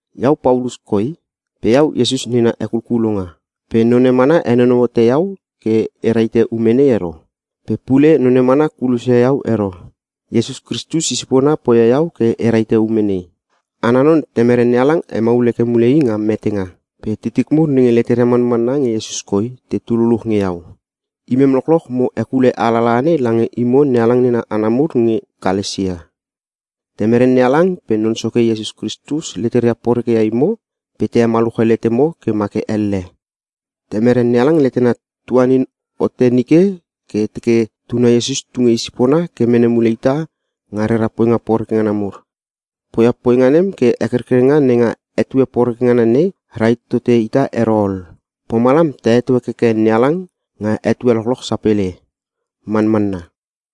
Iau Paulus koi. Pe iau, Iesus nena hekulkulonga. Pe none mana henonou hote iau ke e rahite ume nei ero. Pe pule none mana kulosia iau ero. Iesus Kristus i sipona poia iau ke e rahite ume nei. Ana Non, Temere NeHalang hemaul heke mule I nga metenga. Pe titik mur nenge leteria manmanna nge Iesus koi tetu luluch nge iau. Imem lochloch mo hekule alalaha nei lange imo NeHalang nena hana mur nge Kalasia. Temere NeHalang pe Non Soke Iesus Kristus leteria poreke ia imo pe te hemaluche letemo ke ma ke elle. Temere NeHalang letena tuanin hote nike ke teke Tuna Iesus tunge i sipona ke mene mule ita nga rera poinga poreke ngana mur. Poia poinga nem ke hekerkerenga nenga etue poreke ngana nei rahit tote ita ero ol. Pomalam ta heto hekeke NeHalang nga etue lochloch sapele. Manmanna.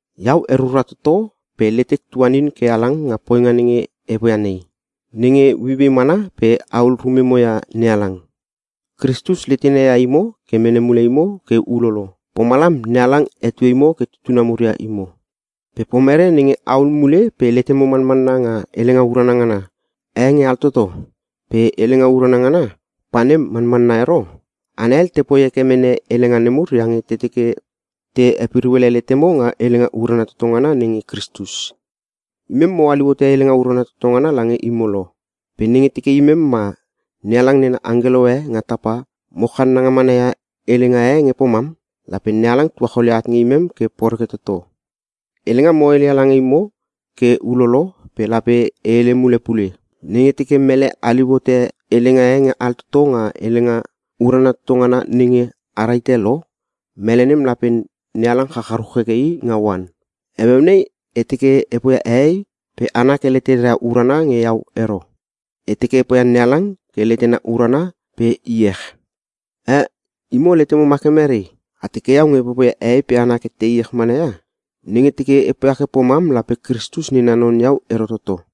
Iau e rura toto pe letek tuanin ke halang nga poinga nenge a poia nei, nenge ueiuei mana pe ahul rumemo ia NeHalang. Kristus letena ia imo ke mene mule imo ke ulolo. Pomalam NeHalang hetue imo ke tutuna mur ia imo. Pe pomere nenge ahul mule pe letemo manmanna nga “helenga urana ngana” e nge altoto? Pe “helenga urana ngana” panem manmanna ero? Hana hel tepoi heke mene helenga nemur iange te teke te hepiriu ele letemo nga Helenga Urana Toto Ngana nenge Kristus. Imem mo haliu hote Helenga Urana Toto Ngana lange imo. Pe nenge teke imem ma NeHalang nena angkelo e nga tapa, mo channanga manaia helenga e nge pomam, lape NeHalang tuachol ia at nge imem ke poreke toto! Helenga mo heleia lange imo ke ulolo pe lape e hele mule pule. Nenge teke mele haliu hote helenga e nge altoto nga Helenga Urana Toto Ngana nenge a rahite lo, mele nem lape NeHalang chacharuch heke i nga oan. Heueu nei e teke e poia hehei pe hana ke leteria urana nge iau ero. E teke e poia NeHalang ke letena urana pe iech. Eh, imo letemo ma ke mere? A teke iau nge e popoia hehei pe hana ke te iech mana ia? Nenge teke e poia ke pomam lape Kristus nena non iau ero toto.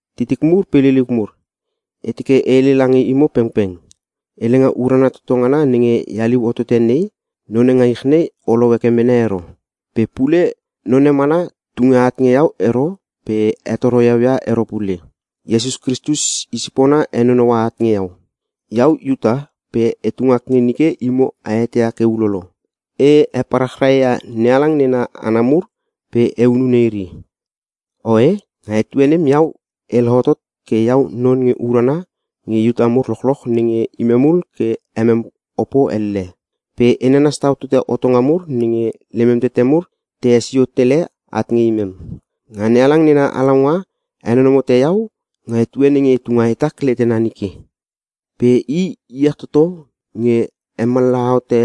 Titik mur pe liliuk mur, e teke e hele lange imo pengpeng. Helenga Urana Toto Ngana nenge e haliu hotote nei none nga ich nei olou heke mene ero. Pe pule none mana tunge at nge iau ero pe hetoro iau ia ero pule. Iesus Kristus i sipona henonoua at nge iau. Iau Iuta pe etu ngak nge nike imo a eteia ke ulolo. E heparachrai ia NeHalang nena hana mur pe e hunune iri. Oe, nga etue nem iau e lohotot ke iau non nge urana nge Iuta mur lochloch nenge imem ul ke emem opo elle. Pe e nanas tau tote hotonga mur nenge lemem tete mur te hesio tele at nge imem. Nga NeHalang nena halaunga, henonou hote iau nga etue nenge etu nga hetak letena nike. Pe I iech toto nge hemallaha hote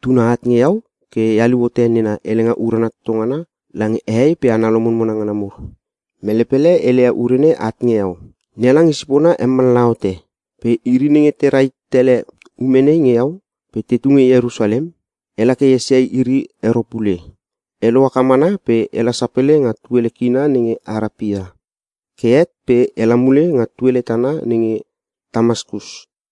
Tuna at nge iau ke e haliu hote nena Helenga Urana Toto Ngana lange hehei pe hana lomomona ngana mur. Mele pele heleia ure nei at nge iau. NeHalang isipona hemallaha hote. Pe iri nenge te rahit tele ume nei nge iau pe tetu nge Ierusalem, ela ke e esia iri ero pule. E lohaka mana pe ela sapele nga tuele kina nenge Arapia. Ke het pe ela mule nga tuele tana nenge Tamaskus.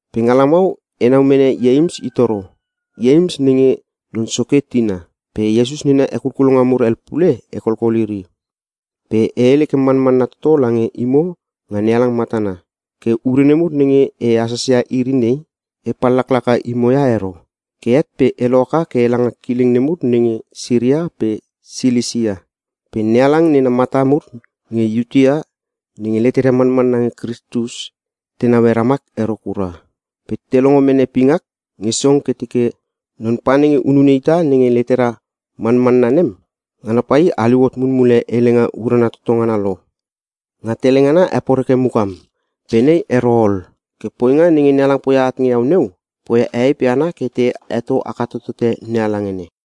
Pe nga lamau enau mene Ieims i toro. Ieims nenge Non Soke tina. Pe Iesus nena hekulkulonga mur hel pule, e kolkol iri. Pe e hele ke manmanna toto lange imo nga NeHalang matana, ke ure nemur nenge e hasas ia iri nei, e pallaklaka imo ia ero. Ke het pe e lohaka ke ela nga kileng nemur nenge Siria pe Silisia. Pe NeHalang nena mata mur nge Iutea nenge leteria manmanna nge Kristus, te naue ramak ero kura. Pe te longo mene pingak nge song ke teke, “Non pa nenge hunune ita nenge letera manmanna nem, ngana pa i haliu hot mulmule Helenga Urana Toto Ngana lo. Nga tele ngana heporeke mukam, pe nei ero ol.” Ke poinga nenge NeHalang poia at nge iau neu, poia hehei pe hana ke te heto haka totote NeHalang ene.